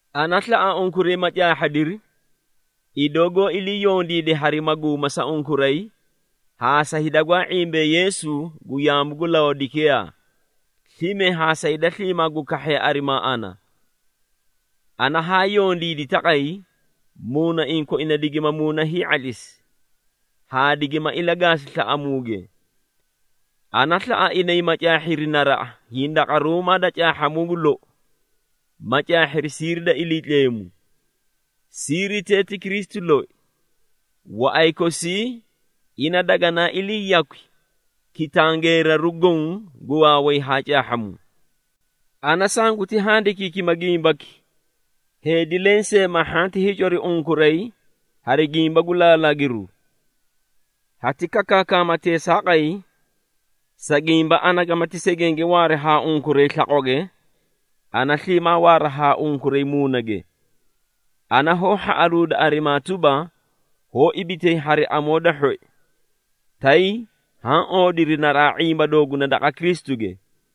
Ana slaꞌa unkuray ma caahhadiri, idoo goó ilii yondiide hari maguuma sa unkuray haa sa hida gwaa ⁄imbee Yeesu gu yaamu gu Laodekiyaa, slime haa sa hida sliimaa gu kahhee arimaa ana. Ana haa yondiidi taqay, muunaiĩ koina digima muuna hii⁄atlisi, haa digima ilagaasi slaꞌamuuge. Ana slaꞌa inay ma caahhiri naraꞌa hindaqaruumaa da caahhamuu gu lou, ma caahhiri siiri da Iliitleemu. Siiritee ti Kristu loi. Waꞌay kosii ina daganaa ilii yakwi kitangeeraru goõ gu waaway haa caahhamuu. Ana sanguti handikiikima gimbaki, heedi lensee ma hhanti hiicori unkuray hari gimba gu laalaagiru. Hati kakaakama teesaaqay, sa gimba ana gamati segenge waari haa unkuray slaqwage, ana sliimaa waaraa haa unkuray muunage. Ana hoó hhaꞌaluuda arimaa tuba, hoó ibitay hari amoo da hhoi, tay haã oodiri naraꞌa ⁄imba dooguna daqa Kristuge.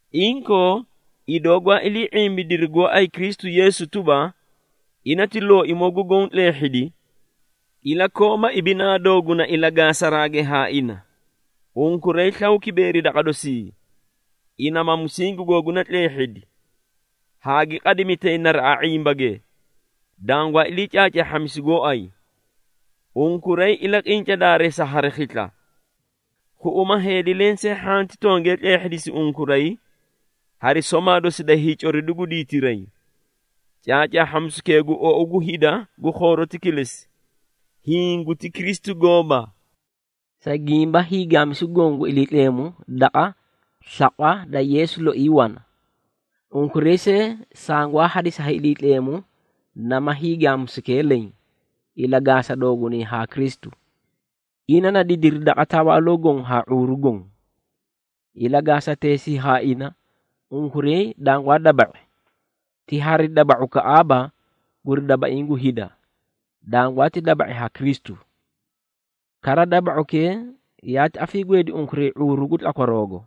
Inkoo, idoo gwaa ilii ⁄imbidiri gooay Kristu Yeesu tuba, ina ti Looimoo gu Goõ tleehhidi, ilakooma ibinaa dooguna ilagaasaraage haa ina. Unkuray slaw kibeeri daqa dosii, ina ma musingi googuna tleehhidi, haa gi qadimitay naraꞌa ⁄imbage, dangwaa ilii caacaahhamisi gooay. Unkuray ilaqinca daareesa hari khisla. Khuꞌuma heedi lensee hhanti tongee tleehhidisi unkuray hari somaa dosi da hiicoridu gu diitiray. Caacaahhamisukee guti ou gu hida gu khooroti kilesi, hiĩ guti Kristu gooba. Sa gimba, hiigaamisu goõ gu Iliitleemu daqa slaqwa da Yeesu loi wana. Unkuray see sangwaa hadisi ha Iliitleemu nama hiigaamisukee leẽ, ilagaasa doogunay haa Kristu. Ina na didiri daqa tawaaloo goõ haa ⁄uuru goõ. Ilagaasateesii haa ina, unkuray dangwaa daba⁄i, ti hari daba⁄ukaꞌaaba guri dabaiĩ gu hida, dangwaati daba⁄i ha Kristu. Kara, daba⁄ukee yaati afiigweedi unkuray ⁄uuru gu tlakwaroogo.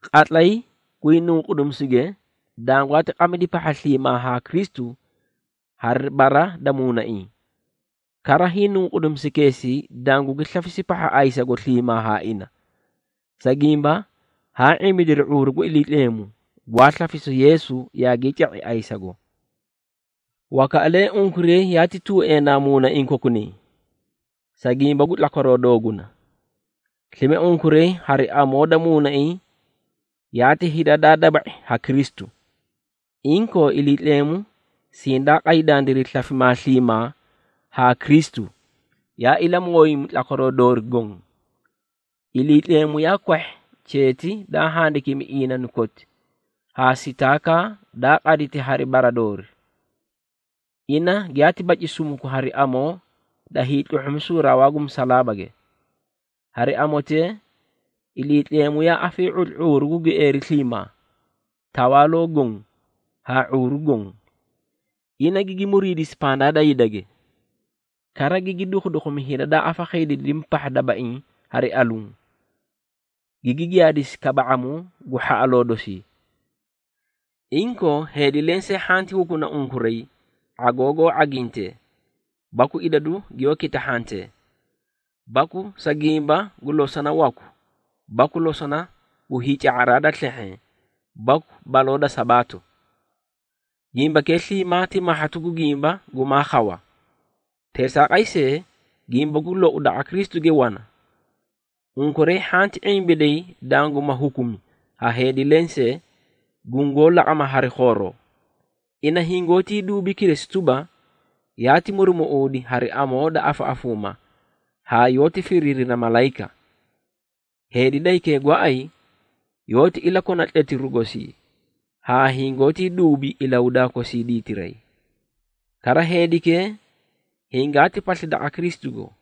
Qatlay gwii nunqudimisuge, dangwaati qamidi pahha sliimaa haa Kristu hari bara da muunaiĩ. Kara, hiinunqudimisukeesii dangugi slafisi pahha ayisasugo sliimaa haa ina, sa gimba haa ⁄imbidiri ⁄uuru gu Iliitleemu, gwaa slafisu Yeesu yaagii ca⁄i ayisago. Wakaꞌalee unkuray yaati tuueenaa muunaiĩ kokunay, sa gimba gu tlakwaroo dooguna. Slime, unkuray hari amoo da muunaiĩ yaati hida daa daba⁄i ha Kristu. Inkoo, Iliitleemu sindaa qay dandiray slafimaa sliimaa haa Kristu, yaa ilamooyimi tlakwaroo doori goõ. Iliitleemu yaa kwahhi cheeti daa handikimi iinanu koti haa sitaakaa daa qaditi hari bara doori. Ina giyaati baci sumuku hari amoo da hiitluhhumisu rawaa gu musalaabage. Hari amotee, Iliitleemu yaa afii⁄utli ⁄uuru gu gieeri sliimaa, tawaaloo goõ haa ⁄uuru goõ, ina gigi muriidisi pandaa da hidage. Kara, gigi dukhudukhumi hida daa afakhiidiidimi pahha dabaiĩ hari aluũ, gigi giyaadisi kaba⁄amuu gu hhaꞌaloo dosii. Inkoo, heedi lensee hhanti hukuna unkuray ⁄agoo goó ⁄agintee baku idadu giyoó kitahhantee, baku sa gimba gu losona waku baku losona gu hiica⁄araa da slehheẽ baku baloo da Sabaato. Gimbakee sliimaa ti mahhatu gu gimba gumaa khawa. Teesaaqay see, gimba gu lou daqa Kristuge wana. Unkuray hhanti ⁄imbiday danguma hukumi ha heedi lensee, gungoó laqama hari khooroo. Ina hingoótii duubi kilesi tuba, yaati murumuꞌuudi hari amoo da afaꞌafuuma haa yoóti firiirina malayika. Heedi da hikee gooay, yoóti ilakona tletiru gosii haa hingoótii duubi ilahudaa kosii diitiray. Kara, heedikee hingaati pasli daqa Kristugo,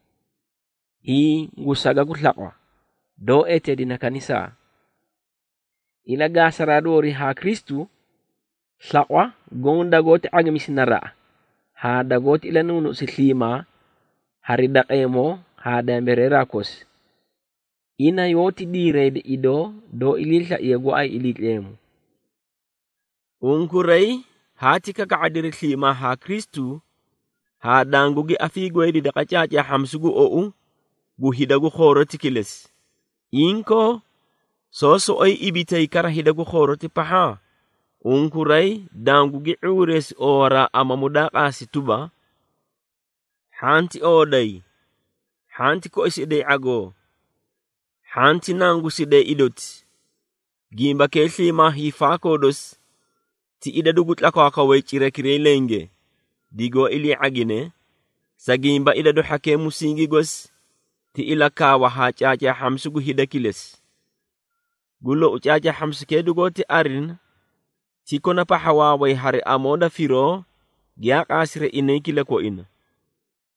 hiĩ gu saga gu slaqwa, doó eteedine kanisaa. Ilagaasaraa doorii haa Kristu, slaqwa goõ dagoóti ⁄agimisi naraꞌa haa dagoóti ilanuunuꞌusi sliimaa hari daqeemoo haa dambireera kosi, ina yoóti diirayda idoo doó iliislaiye gooay Iliitleemu. Unkuray haati kaka⁄adiri sliimaa haa Kristu haa dangugi afiigweedi daqa caacaahhamisu gu ou gu hida gu khooroti kilesi. Inkoo, soó soꞌoyi ibitay kara hida gu khooroti pahha? Unkuray dangugi ⁄uureesi oowaraa amamu daa qaasi tuba, “Hhanti ooday, hhanti koisiday ⁄agoo, hhanti nangusiday idoti!” Gimbakee sliimaa hiifaakoo dosi ti idadu gu tlakwaakwawee cirakiray lenge digoó ilii ⁄agine, sa gimba idadu hhakee musingi gosi ti ilakaawa haa caacaahhamisu gu hida kilesi. Gu lou, caacaahhamisukee dugoóti arina ti kona pahha waaway hari amoo da firoo giyaa qaasiri inay kilakoina,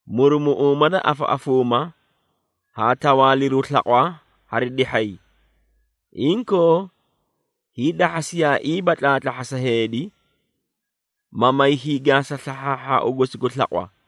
murumuꞌuuma da afaꞌafuuma haa tawaaliru slaqwa hari dihhay. Inkoo, hiidahhasiyaaiiba tlaatlahhasa heedi, ma may hiigaasa slahhaahhaau gosi gu slaqwa.